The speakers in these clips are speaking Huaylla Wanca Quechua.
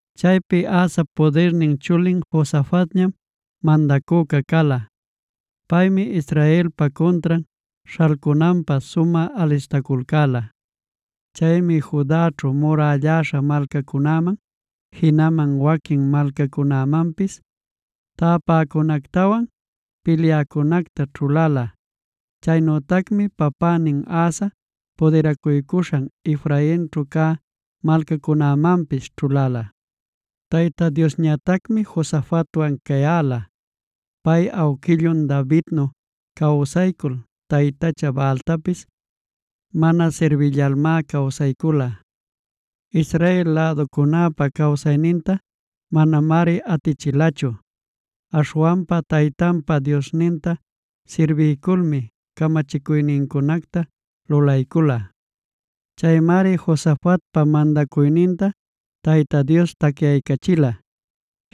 Chaypi Asap pudirnin chulin Josafatñam mandacüca cala. Paymi Israelpa cuntran śhalcunanpä sumä alistaculcäla. Chaymi Judaćhu murälläśha malcacunäman, jinaman waquin malcacunamanpis täpäcunactawan pilyäcunacta ćhuläla. Chaynütacmi papänin Asa pudiracuycuśhan Efrainćhu cä malcacunämanpis ćhuläla. Tayta Diosñatacmi Josafatwan cayäla. Pay awquillun Davidnu cawsaycul taytacha Baaltapis mana sirbillalmá cawsaycula. Israel läducunäpa cawsaynintá manamari atichilachu. Aśhwanpa taytanpa Diosninta sirbiyculmi camachicuynincunacta lulaycula. Chaymari Josafatpa mandacuyninta Tayta Dios tacyaycachila.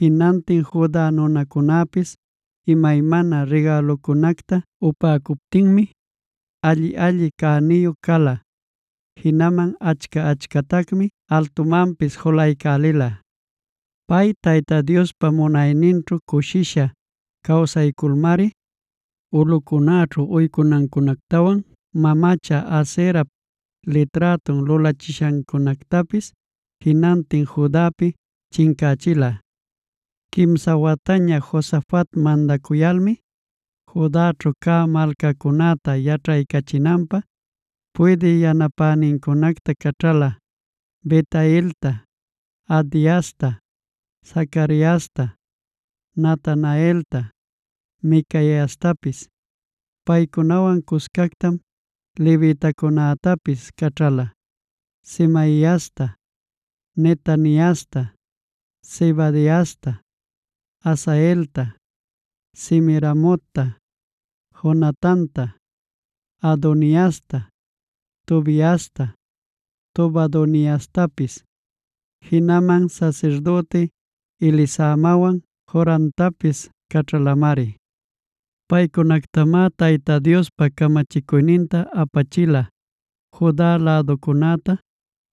Jinantin Juda nunacunäpis imaymana rigälucunacta upäcuptinmi, alli-alli cäniyu cala; jinaman achca-achcatacmi altumanpis julaycälila. Pay, Tayta Diospa munayninćhu cushisha cawsayculmari, ulꞌucunäćhu uycunacunactawan mamacha Aserap liträtun lulaśhancunactapis, jinantin Judapi chincächila. Quimsa wataña Josafat mandacuyalmi, Judaćhu cä malcacunäta yaćhaycachinanpä puydï yanapänincunacta caćhala: Bel-hailta, Abdiasta, Zacariasta, Natanaelta, Micaiastapis. Paycunawan cuscactam levitacunätapis caćhala: Semaiasta, Netaniasta, Zebadiasta, Asaelta, Semiramotta, Jonatanta, Adoniasta, Tobiasta, Tobadoniastapis; jinaman sasirdüti Elisamawan Joramtapis caćhalamari. Paycunactamá Tayta Diospa camachicuyninta apachila Juda läducunäta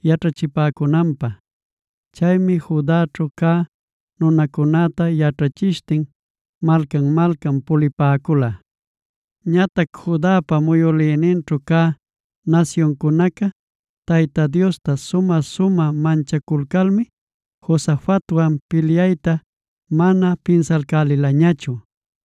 yaćhachipäcunanpä. Chaymi Judaćhu cä nunacunäta yaćhachishtin malcan-malcan pulipäcula. Ñatac Judapa muyülïninćhu cä nasyuncunaca Tayta Diosta sumä-sumä manchaculcalmi, Josafatwan pilyayta mana pinsalcälilañachu.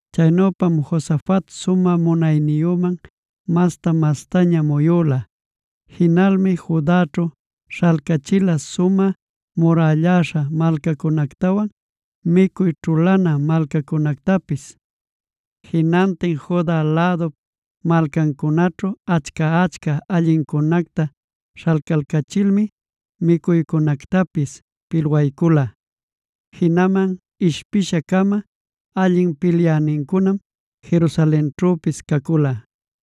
Chaynüpam Josafat sumä munayniyüman masta-mastaña muyula. Jinalmi Judaćhu śhalcachila sumä murälläśha malcacunactawan micuy ćhulana malcacunactapis. Jinantin Juda lädup malcancunaćhu achca-achca allincunacta śhalcalcachilmi micuycunactapis pilwaycula. Jinaman ishpisha-cama allin pilyänincunam Jerusalenćhüpis cacula.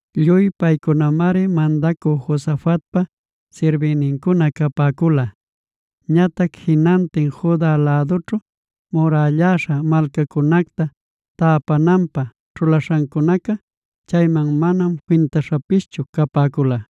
Lluy paycunamari mandacü Josafatpa sirbïnincuna capäcula. Ñatac jinantin Juda lädućhu murälläśha malcacunacta täpananpä ćhulaśhancunacá, chayman manam fintaśhapischu capäcula.